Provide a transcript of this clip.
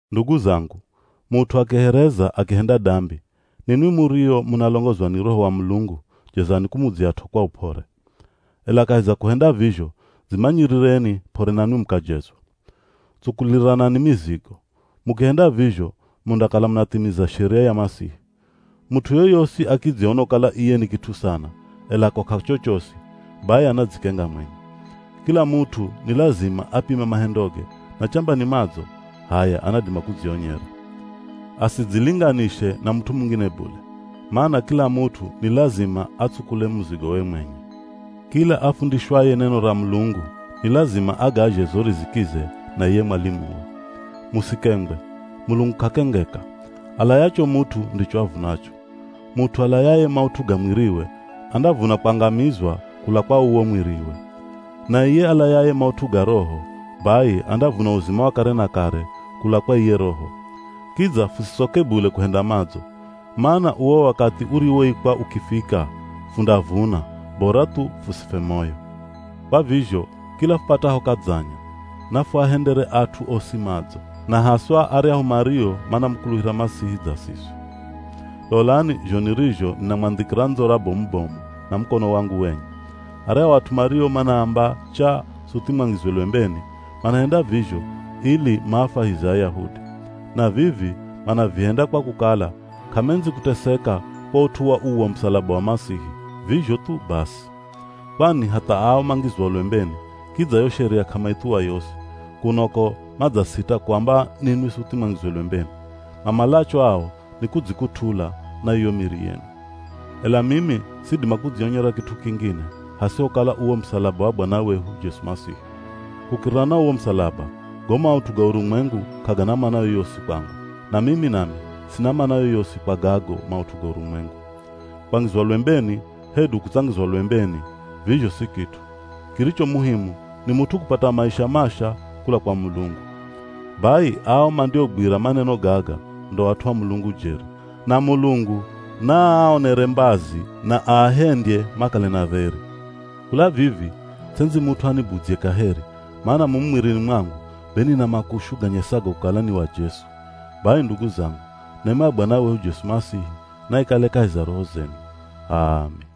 Ndugu zangu, mut'u akihereza, akihenda dambi, ninwi murio munalongozwa ni Roho wa Mulungu jezani kumudzyat'o kwa up'ore. Ela kahi za kuhenda vizho, dzimanyirireni p'ore nanwi mukajezwa. Tsukuliranani mizigo. Mukihenda vizho mundakala munathimiza sheria ya Masihi. Mut'u yoyosi akidziona kukala iye ni kit'u sana, ela ko k'achochosi, bai anadzikenga mwenye. Kila mut'u ni lazima apime mahendoge, na chamba ni madzo, h'aya anadima kudzionyera. Asidzilinganishe na mut'u mungine bule. Mana kila mut'u ni lazima atsukule muzigowe mwenye. Kila afundishwaye neno ra Mulungu ni lazima agazhe zo rizikize na iye mwalimuwe. Musikengwe! Mulungu k'akengeka. Alayacho mut'u ndicho avunacho. Mut'u alayaye maut'u ga mwiriwe, andavuna kwangamizwa kula kwa uwo mwiriwe. Na iye alayaye maut'u ga Roho, bai andavuna uzima wa kare na kare kula kwa iye Roho. Kidza fusitsoke bule kuhenda madzo, mana uwo wakathi uriwoikwa ukifika, fundavuna, bora thu fusifwe moyo. Kwa vizho kila fupataho kadzanya, nafuahendere at'u osi madzo, na haswa aryahu mario manamukuluhira Masihi dza siswi. Lolani zho nirizho ninamwandhikira ndzora bomu-bomu na mukono wangu wenye! Aryahu at'u mario manaamba chaa suthi mwangizwe lwembeni, manahenda vizho ili maafwahize Ayahudi. Na vivi manavihenda kwa kukala k'amendzi kuteseka kwa ut'u wa uwo musalaba wa Masihi, vizho thu basi. Kwani hatha ao mangizwao lwembeni, kidza yo Sheria k'amaithuwa yosi, kuno ko madzasita kuamba ninwi suthi mwangizwe lwembeni. Mamalacho ao ni kudzikut'ula na iyo miri yenu. Ela mimi sidima kudzionyera kit'u kingine, hasihokala uwo musalaba wa Bwana wehu Jesu Masihi. Kukirira na uwo musalaba, go maut'u ga urumwengu k'agana mana yoyosi kwangu, na mimi nami sina mana yoyosi kwa gago maut'u ga urumwengu. Kwangizwa lwembeni, hedu kutsangizwa lwembeni, vizho si kit'u. Kiricho muhimu ni mut'u kupata maisha masha kula kwa Mulungu. Bai ao mandiogwira maneno gaga ndo at'u a Mulungu jeri, na Mulungu naaonere mbazi na aahendye makale na dheri. Kula vivi, ts'endzi mut'u anibudzye kaheri, mana mumu mwirini mwangu be nina makushu ganyesago kukala ni wa Jesu. Bai ndugu zangu, nema ya Bwana wehu Jesu Masihi naikale kahi za roho zenu. H'aami.